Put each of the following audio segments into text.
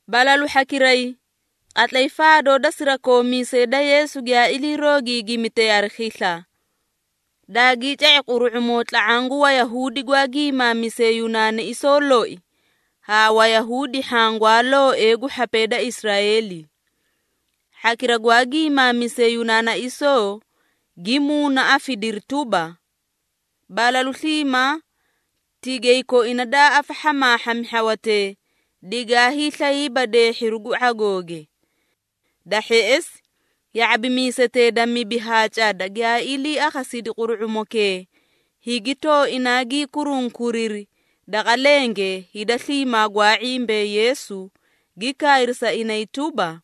Balalu hhakiray, qatlay faadoo da sirakoomiisee da Yeesu giyaa ilii roogiigimitee hari khisla, daagii ca⁄i quru⁄umoo tla⁄aã gu Wayahuudi gwaa giimaamisee Yunaanaisoo loi ha Wayahuudi hhaã gwaa looee gu hhapee da Israeeli. Hhakira gwaa giimaamisee Yunaanaisoo gi muunaafidiri tuba, balalu sliimaa tigay koina daa afahhamaahhami hhawatee, digaa hiislayiiba deehhiru gu ⁄agooge. Da hheꞌesi ya⁄abimiisetee da mibi ha cada giyaa ilii akhasidi quru⁄umokee, higi tooinaa gii kurunkuriri daqa lenge hida sliimaa gwaa ⁄imbee Yeesu, gi kaayri sa inay tuba,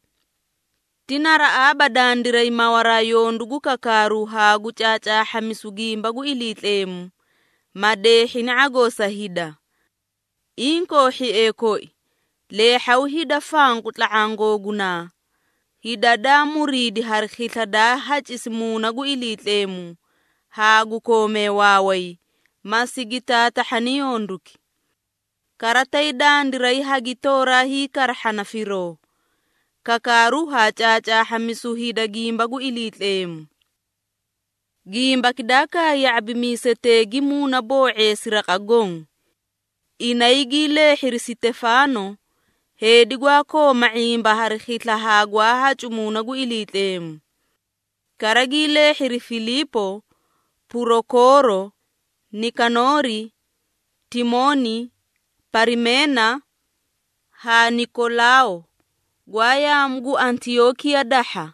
“Ti naraꞌaaba dandiray mawaraa yondu gu kakaaru haa gu caacaahhamisu gimba gu Iliitleemu, ma deehhini ⁄agoo sa hida. Inkoo hhiee koi, leehhaw hida fanqu tla⁄aã googunaa, hida daa muriidi hari khisla daa hacisi Muuna gu Iliitleemu haa gu koomee waaway, ma sigi taatahhani yonduki. Kara tay dandiray hagitooraa hiikarahhana firoo, kakaaru haa caacaahhamisu hida gimba gu Iliitleemu.” Gimbaki daa kaay ya⁄abimiisetee gi muunaboo⁄eesi raqa goõ. Inay gii leehhiri Sitefaano, heedi gwaa kooma ⁄imba hari khisla haa gwaa hacu Muuna gu Iliitleemu. Kara gii leehhiri Filiipo, Purokooro, Nikanoori, Timooni, Parimeena haa Nikolaao gwaa yaamu gu Antiyookiya dahha,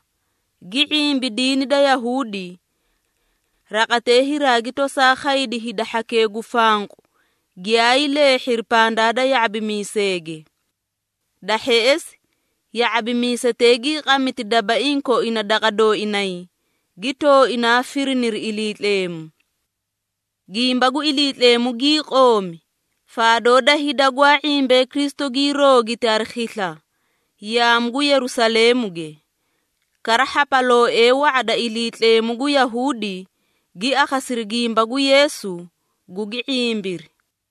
gi ⁄imbi diini da Yahuudi. Raqatee hiraagi tosaa khaydi hida hhakee gu fanqu giyaay leehhiri pandaa da ya⁄abimiiseege. Da hheꞌesi ya⁄abimiisetee gii qamiti dabaiĩ koina daqa dooinay, gi tooinaa firiniri Iliitleemu. Gimba gu Iliitleemu gii qoomi, faadoo da hida gwaa ⁄imbee Kristu gii roogiti hari khisla yaamu gu Yerusaleemuge. Kara hhapalooee wa⁄a da Iliitleemu gu Yahuudi gi akhasiri gimba gu Yeesu, gugi ⁄imbiri.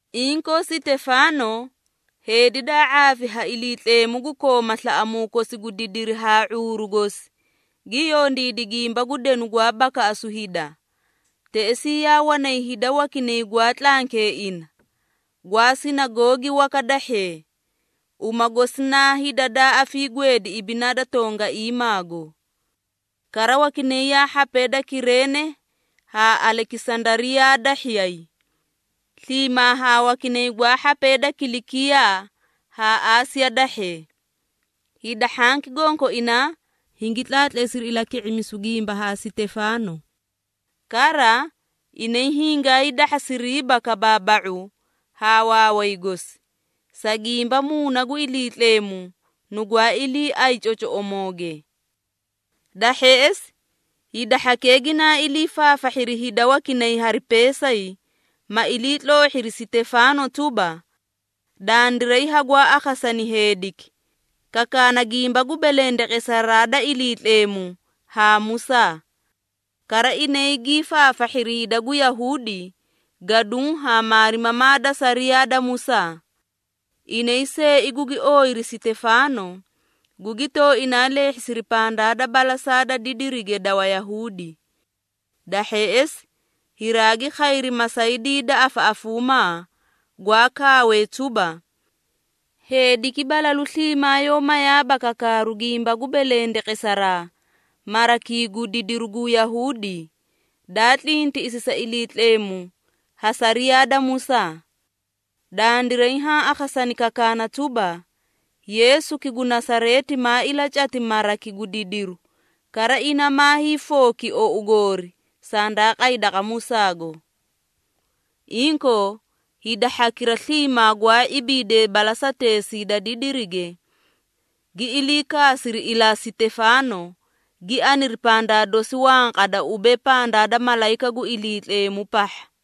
Inkoo Sitefaano, heedi daa ⁄aafi ha Iliitleemu gu kooma slaꞌamuu kosi gu didiri haa ⁄uuru gosi, gi yondiidi gimba gu denu gwaa bakaꞌasu hida. Teꞌesii yaa wanay hida wakinay gwaa tlankee ina, gwaa sinagoogi waka dahhee, uma gosi naa “Hida daa afiigweedi ibinaa da tongaiimaago.” Kara wakinay yaa hhapee da Kireene haa Alekisandariyaa dahhiyay, sliimaa haa wakinay gwaa hhapee da Kilikiyaa haa Aasiya dahhee. Hida hhanki gonkoinaa hingi tlaatleesiri ilaki⁄imisu gimba haa Sitefaano. Kara, inay hingaay dahhasiriiba kabaaba⁄u haa waaway gosi, sa gimba Muuna gu Iliitleemu nugwaa iliiaꞌaay cocoꞌomooge. Da hheꞌesi hida hhakee ginaa ilii faafahhiri hida wakinay hari peesay, ma iliitloohhiri Sitefaano tuba, “Dandiray hagwaa akhasani heediki, kakaana gimba gu belendeqesaraa da Iliitleemu haa Musaa.” Kara inay gii faafahhiri hida gu Yahuudi, gaduũ haa maarimamaa da sariyaa da Musaa. Inay seei gugi ooyiri Sitefaano, gugi tooinaa leehhisiri pandaa da balasaa da didirige da Wayahuudi. Da hheꞌesi hiraagi khayri masaydii da afaꞌafuumaa, gwaa kaawee tuba, “Heediki balalu sliimaa yoó mayaaba kakaaru gimba gu belendeqesaraa marakii gu didiru gu Yahuudi, daa tlintiꞌisi sa Iliitleemu ha sariyaa da Musaa.” Dandiray haã akhasani kakaana tuba, Yeesuki gu Nasareeti maa ilacati maraki gu didiru, kara ina maa hiifooki ou goori sandaa qay daqa Musaago. Inkoo, hida hhakira sliimaa gwaa ibiidee balasateesii da didirige, gi ilii kaasiri ilaa Sitefaano, gi aniri pandaa dosi wanqada ubee pandaa da malayika gu Iliitleemu pahha.